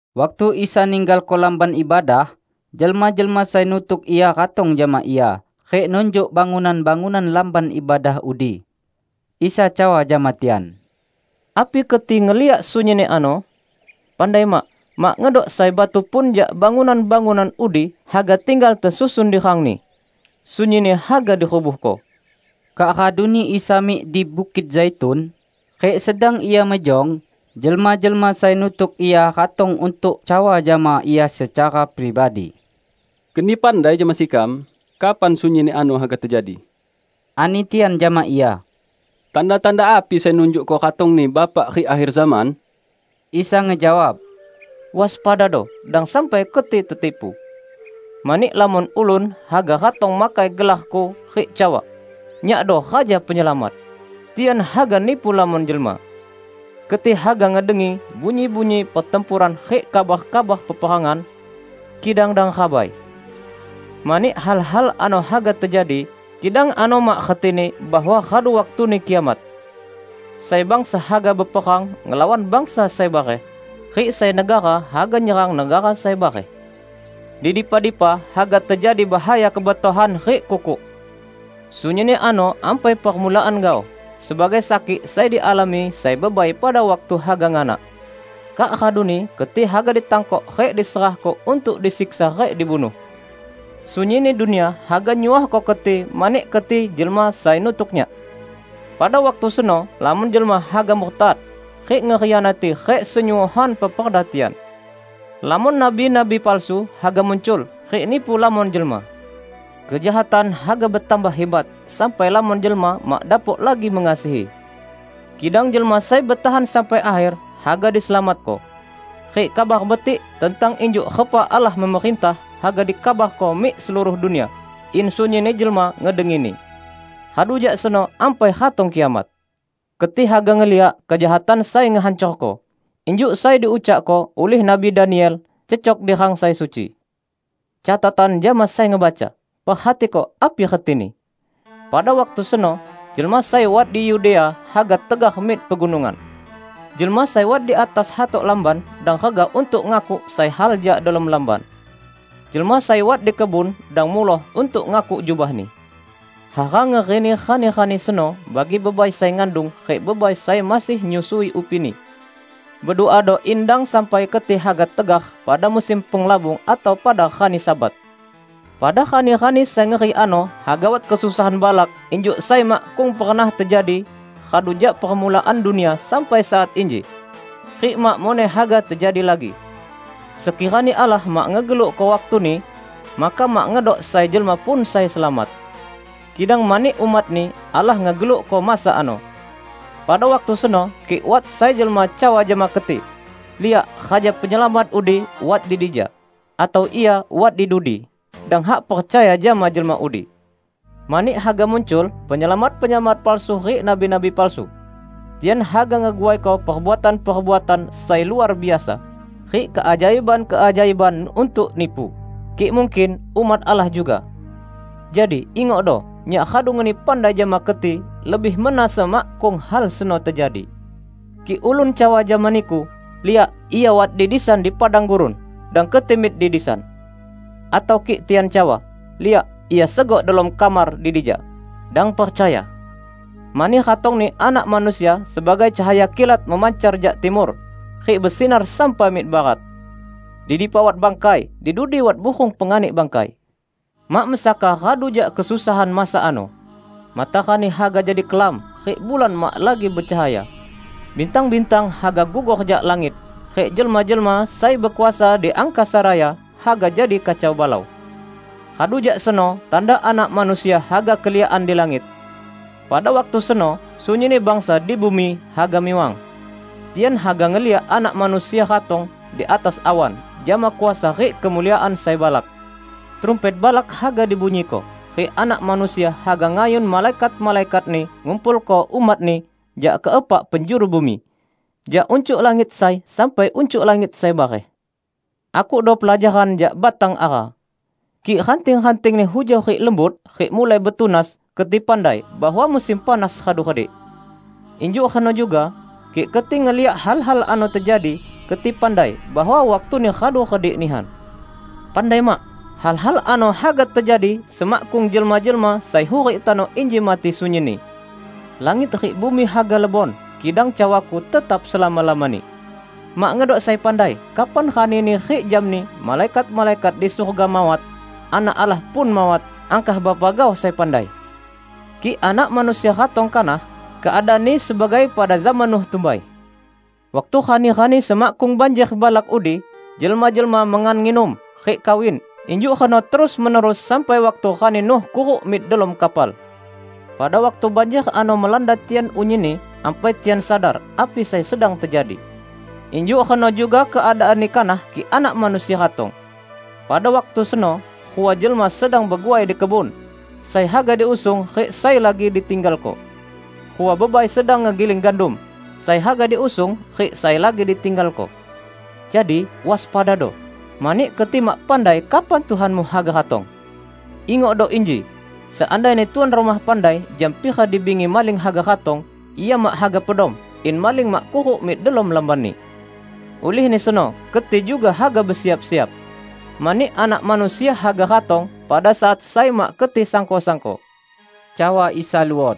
Waktu Isa ninggalko Lamban Ibadah, jelma-jelma sai nutuk Ia ratong jama Ia rik nunjuk bangunan-bangunan Lamban Ibadah udi. Isa cawa jama tian, "Api keti ngeliak sunyinni ano? Pandai mak, mak ngedok sai batu pun jak bangunan-bangunan udi haga tinggal tesusun di rangni. Sunyinni haga dirubuhko." Kak raduni Isa mik di Bukit Zaitun, rik sedang Ia mejong, jelma-jelma sai nutuk Ia ratong untuk cawa jama Ia secara pribadi. "Keni pandai jama sekam kapan sunyinni ano haga tejadi," ani tian jama Ia. "Tanda-tanda api sai nunjukko ratong-Ni Bapak rik akher zaman?" Isa ngejawab, "Waspadado, dang sampai keti tetipu. Mani lamon ulun haga ratong makai gelar-Ku rik cawa, 'Nyakdo Raja Penyelamat!' Tian haga nipu lamon jelma. Keti haga ngedengi bunyi-bunyi pertempuran rik kabar-kabar peperangan, kidang dang rabai. Mani hal-hal ano haga tejadi, kidang ano mak retini bahwa radu waktuni kiamat. Sai bangsa haga beperang ngelawan bangsa sai bareh, rik sai negara haga nyerang negara sai bareh. Di dipa-dipa haga tejadi bahaya kebetohan rik kukuk. Sunyinni ano ampai permulaan gaoh, sebagai sakik sai dialami sai bebai pada waktu haga nganak. Kak raduni keti haga ditangkok rik diserahko untuk disiksa rik dibunuh. Sunyinni dunia haga nyuohko keti mani keti jelma sai nutuk Nyak. Pada waktu seno lamon jelma haga murtad, rik ngekhianati rik senyuohan peperda tian. Lamon nabi-nabi palsu haga muncul, rik nipu lamon jelma. Kejahatan haga betambah hibat sampai lamon jelma mak dapok lagi mengasihi. Kidang jelma sai betahan sampai akher, haga diselamatko. Rik Kabar Betik tentang injuk repa Allah memerintah haga dikabarko mik seluruh dunia, in sunyinni jelma ngedengini. Radu jak seno ampai ratong kiamat." "Keti haga ngeliak 'Kejahatan sai ngehancorko', injuk sai diucakko ulih Nabi Daniel, cecok di rang sai suci. (Catatan jama sai ngebaca: Perhatiko api retini!) Pada waktu seno, jelma sai wat di Yudea haga tegar mik pegunungan. Jelma sai wat di atas hatok lamban dang regah untuk ngakuk sai hal jak delom lamban. Jelma sai wat di kebun dang muloh untuk ngakuk jubahni. Hara ngerini rani-rani seno bagi bebai sai ngandung, rik bebai sai masih nyusui upini! Beduado in dang sampai keti haga tegar pada musim penglabung atau pada rani Sabat! Pada rani-rani sai ngeri ano haga wat kesusahan balak injuk sai makkung pernah tejadi radu jak permulaan dunia sampai saat inji, rik mak muneh haga tejadi lagi. Sekirani Allah mak ngegelukko waktuni; maka mak ngedok sai jelma pun sai selamat. Kidang mani umat-Ni, Allah ngegelukko masa ano. Pada waktu seno kik wat sai jelma cawa jama keti, 'Liak, Raja Penyelamat udi wat di dija!' atau 'Ia wat di dudi!' -- dang hak percaya jama jelma udi. Mani haga muncul penyelamat-penyelamat palsu rik nabi-nabi palsu. Tian haga ngeguaiko perbuatan-perbuatan sai luar biasa, rik keajaiban-keajaiban untuk nipu, kik mungkin, umat Allah juga. Jadi, ingokdo! Nyak radu ngeni pandai jama keti lebih mena semakkung hal seno tejadi. Kik ulun cawa jama niku, 'Liak, Ia wat di disan di padang gurun!' -- dang keti mik di disan. Atau kik tian cawa, 'Liak, Ia segok delom kamar di dija!' -- dang percaya. Mani ratongni Anak Manusia sebagai cahaya kilat memancar jak timur, rik besinar sampai mik barat. Di dipa wat bangkai, di dudi wat burung penganik bangkai." "Mak mesaka radu jak kesusahan masa ano, matarani haga jadi kelam, rik bulan mak lagi becahaya. Bintang-bintang haga gugor jak langit, rik jelma-jelma sai bekuasa di angkasa raya haga jadi kacau balau. Radu jak seno tanda Anak Manusia haga keliakan di langit. Pada waktu seno sunyinni bangsa di bumi haga miwang. Tian haga ngeliak Anak Manusia ratong di atas awan jama kuasa rik kemuliaan sai balak. Trumpet balak haga dibunyiko, rik Anak Manusia haga ngayun malaikat-malaikat-Ni ngumpulko umat-Ni jak ke epak penjuru bumi, jak uncuk langit sai sampai uncuk langit sai bareh." "Akukdo pelajaran jak batang ara. Kik ranting-rantingni hujau rik lembut, rik mulai betunas, keti pandai bahwa musim panas radu redik. Injuk reno juga kik keti ngeliak hal-hal ano tejadi, keti pandai bahwa waktuni radu redik nihan. Pandai mak! Hal-hal ano haga tejadi semakkung jelma-jelma sai hurik tano inji mati sunyinni. Langit rik bumi haga lebon, kidang cawa-Ku tetap selama-lamani." "Mak ngedok sai pandai kapan ranini rik jamni, malaikat-malaikat di surga mawat, Anak Allah pun mawat, angkah Bapa gaoh sai pandai. Kik Anak Manusia ratong kanah, keadaanni sebagai pada zaman Nuh tumbai. Waktu rani-rani semakkung banjer balak udi, jelma-jelma mengan nginum, rik kawin. Injuk reno terus-menerus sampai waktu rani Nuh kuruk mik delom kapal. Pada waktu banjer ano melanda tian unyinni, ampai tian sadar api sai sedang tejadi. Injuk reno juga keadaanni kanah kik Anak Manusia ratong. Pada waktu seno, rua jelma sedang beguai di kebun: Sai haga diusung, rik sai lagi ditinggalko. Rua bebai sedang ngegiling gandum: Sai haga diusung, rik sai lagi ditinggalko. Jadi, waspadado, mani keti mak pandai kapan Tuhanmu haga ratong. Ingokdo inji! Seandaini tuan rumah pandai jam pira di bingi maling haga ratong, ia mak haga pedom, in maling mak kuruk mik delom lambanni. Ulihni seno, keti juga haga besiap-siap. Mani Anak Manusia haga ratong pada saat sai mak keti sangko-sangko." Cawa Isa luot,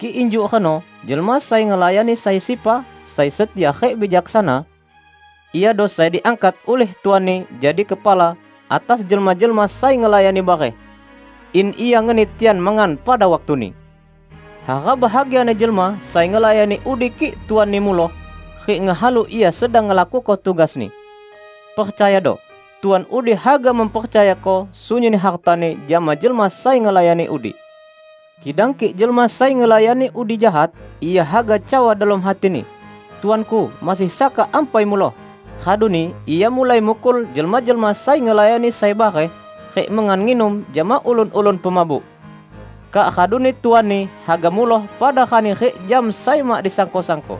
"Kik injuk reno, jelma sai ngelayani sai sepa sai setia rik bijaksana? Iado sai diangkat ulih tuanni jadi kepala atas jelma-jelma sai ngelayani bareh, in ia ngeni tian mengan pada waktuni. Hara bahagiani jelma sai ngelayani udi kik tuanni muloh, rik ngehalu ia sedang ngelakuko tugasni. Percayado, tuan udi haga mempercayako sunyinni hartani jama jelma sai ngelayani udi. Kidang kik jelma sai ngelayani udi jahat, ia haga cawa delom hatini, 'Tuanku masih saka ampai muloh,' raduni ia mulai mukul jelma-jelma sai ngelayani sai bareh, rik mengan nginum jama ulun-ulun pemabuk. Kak raduni tuanni haga muloh pada rani rik jam sai mak disangko-sangko.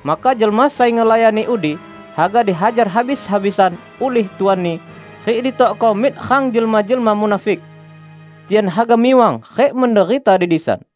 Maka jelma sai ngelayani udi haga dihajar habis-habisan ulih tuanni, rik ditokko mik rang jelma-jelma munafik. Tian haga miwang rik menderita di disan."